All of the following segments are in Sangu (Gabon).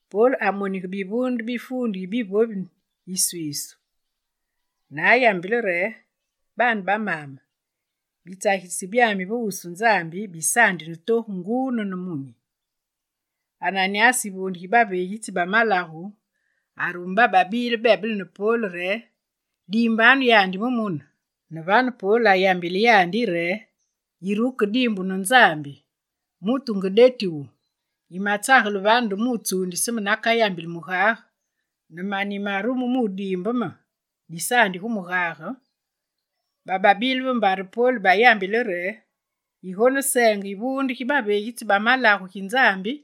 Pol amonige bivuunde bi fuundu yi bivovi iswiisu ne ayambile re: «Baane ba maame, bitsagilitsi byami ve wusu Nzambi, bisaandi ne togu nguu ne nemunyi.» Ananyas yivuunde gi baveegitsi ba malagu, arume bababile bebele ne Pol re: «Diimbanu yandi mu mune!» Ne vane Pol ayambile yandi re: «Yire wukediimbu ne Nzambi, mutu nge deti wu! Yimatsagele vane nde mu wutsuundise me nakayambili mugage, ne mane yimarume mu wudiimbe me, disaandi gu mugage!» Bababile ve mbare Pol bayambile yandi re: «Yigoneseenge yivuunde gi baveegitsi ba malagu gi Nzambi!»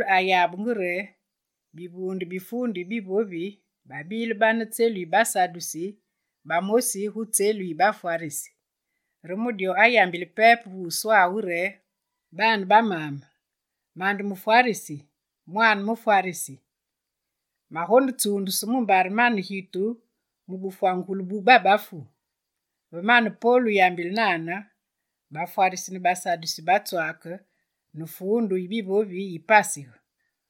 Pol ayabenge re bivuunde bi fuundu yi bivovi babile bane gu tselu yi basadusi ne bamosi gu tselu yi bafwarisi. Re mu dyo ayambile pepe ve wuswawu re: «Baane ba maame, mande mufwarisi, mwaane mufwarisi; magonetsuundusu mumbare mane gitu mu bufwangugulu bu babafu.» Ve mane Pol wuyambile nane, bafwarisi ne basadusi batswaake, ne fuundu yi bivovi yipasige.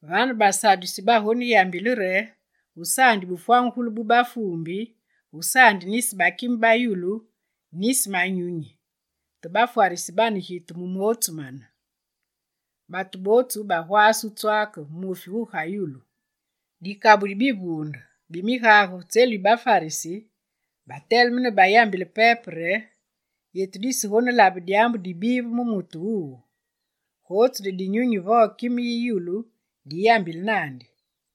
Vane, basadusi bagoneyambile re gusaandi bufwangugulu bu bafuumbi, gusaandi nisi bakime ba yulu, nisi manyunyi. Te bafwarisi bane gitu mu mootsu mane. Batu bootsu bagwaase wutswaake muufi gugayulu. Dikabu di bivuunde bi migage gu tselu yi bafwarisi bateleme ne bayambile pepe re: «Yetu disegonelabe dyaambu dibive mu mutu wuwu. Gotsu nde dinyunyi vo kime yi yulu diyambile naandi.»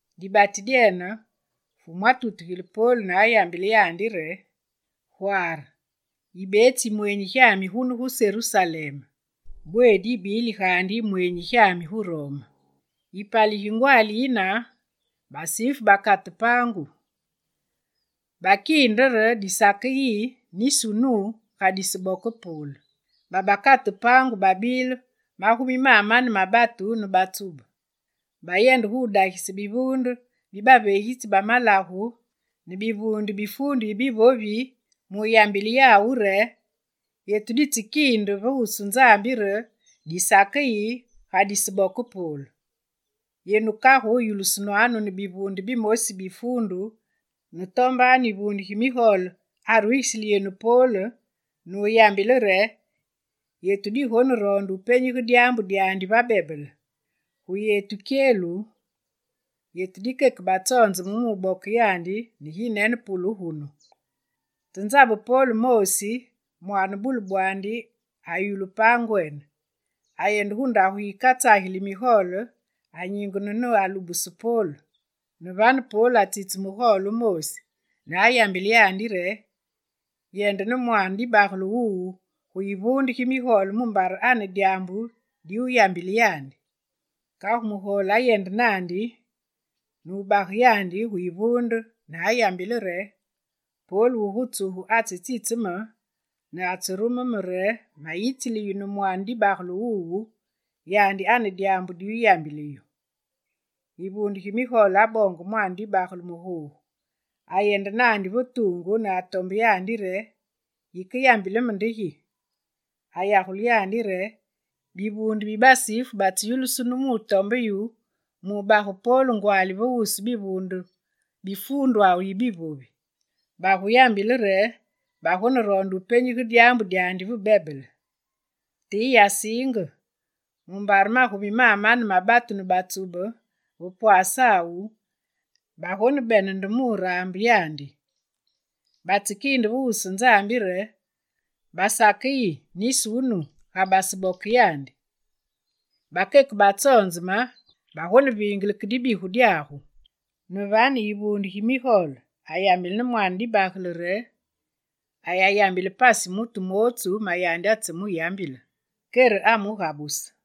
Dibati dyene, Fumu atutugile Pol ne ayambile yandi re: «Gware! Yibetsi yimwenyi gyami gunu, gu Serusalem. Bweedi yibili gaandi yimweenyi gyami gu Rome.» Yipali gigwaali yine, basifu bakate paangu. Bakiinde re disakeyi nisi wunu, ga diseboke Pol. Babakate paangu babile magumi mamane ma batu ne batsube. Bayende dagise bivuunde bi baveegitsi ba malagu ne bivuunde bi fuundu yi bivovi mu wuyambile yawu re: «Yetu ditsekiinde va wusu Nzambi re disakeyi, ga disaboke Pol. Yenu kagu yulusunwanu ne bivuunde bimosi bi fuundu ne tombanu yivuunde gi migole arugisili yenu Pol ne wuyambile re yetu digoneroonde penyige dyaambu dyandi ve bebele. Gu yetu kyelu, yetu dikeke batsonzeme mu wuboke yandi ne ginene pule gunu.» Te nzabe Pol moosi, mwaane bule bwandi ayulu paangwene, ayende gu ndagu yikatsageli migole, anyingene ne alubuse Pol. Ne vane Pol atsitse mugole wumoosi ne ayambile yandi re: «Yende ne mwaane dibagele wuwu gu yivuunde gi migole mumbare ane ma dyaambu diwuyambile yandi.» Kagu mugole ayende naandi, ne wubage yandi gu yivuunde ne ayambile re: «Pol wugu tsugu atsetsitse me ne atserume me re mayitsili yu ne mwaane dibagele wuwu, yandi ane dyaambu di wuyambile yu.» Yivuunde gi migole aboonge mwaane dibagele mu googu, ayende naandi va tuungu ne atombe yandi re: «Yikeyambile me nde gi?» Ayagule re: «Bivuunde bi basifu batseyulusunu mu wutombe yu mu wubage Pol ngwaali va wusu bivuunde bi fuundwawu yi bivovi. Baguyambile re, bagoneroonde wupenyige dyaambu dyandi ve bebele. Te yiyasiinge, mumbare magumi mamane ma batu ne batsube va pwasawu bagonebene nde wuraambe yandi. Batsekiinde va wusu Nzambi re: basakeyi nisi wunu, ga baseboke yandi. Bakeke batsonzeme, bagoneviinge ke dibigu dyagu.» Ne vane yivuunde gi migole ayambile ne mwaane dibagele re ayanyigule pasi mutu mootsu ma yandi atsemuyambile. Kere amugabuse.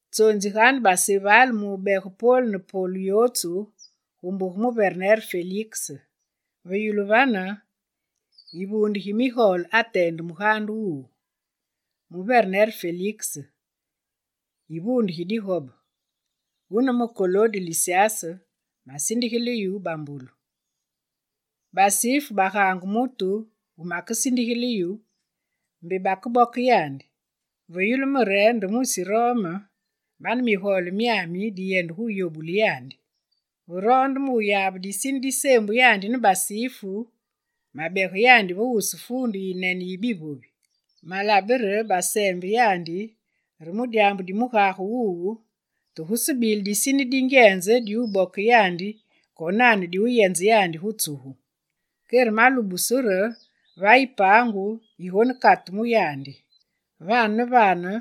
Tsonziganu baseval mu wubege Pol ne polu yootsu gu mbuge muverner Feliks.» Ve yulu vane, yivuunde gi migole ateende mugaande wuwu: «Muverner Feliks, yivuunde gi digobe, wune me Kolode Lisyas masindigile yu bambolu. Basifu bagaange mutu wumakesindigile yu, mbe bakeboke yandi. Ve yulu me re nde mwisi Rome, mane migole myami diyende gu wuyobule yandi. Ve roonde me wuyabe disine diseembu yandi ne basifu, mabege yandi va wusu fuundwawu yiyinene yi bivovi. Malabe re baseembe yandi re mu dyaambu di mugage wawu, te gusebile disine dingyenze diwuboke yandi konane diwuyenze yandi gu tsugu. Kere malubusu re vayi paangu yigonekatu mu yandi. Vane ne vane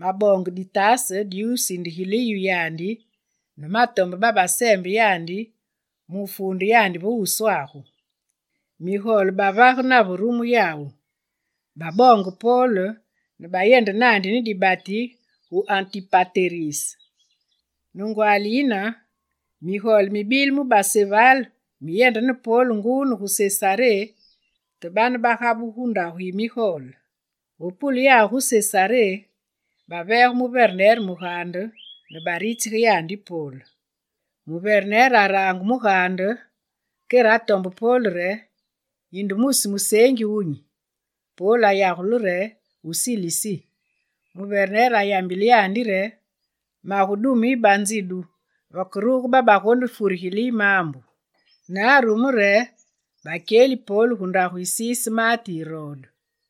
maboonge ditaase diwusindigile yu yandi ne matombe babaseembe yandi mu wufuunde yandi va wuswagu.» Migole bavage nave rumu yawu: baboonge Pol ne bayende naandi ne dibati gu Antipateris. Ne ngwaali yine, migole mibile mu baseval miyende ne Pol nguu ne gu Sesaré, te bane bagabugu ne gu ndagwawu yi migole Ve pule yawu gu Sesaré, baveege muverner mugaande ne baritsige yandi Pol. Muverner araange mugaande, kere atombe Pol re: «Yinde mwisi museengi wunyi?» Pol ayagule re: «wu Silisi.» Muverner ayambile yandi re: «Magudume yu banzidu vakeruge babagonefurigile yu maambu.» Ne arume re bakyeli Pol gu ndagu yi siise maate Irode.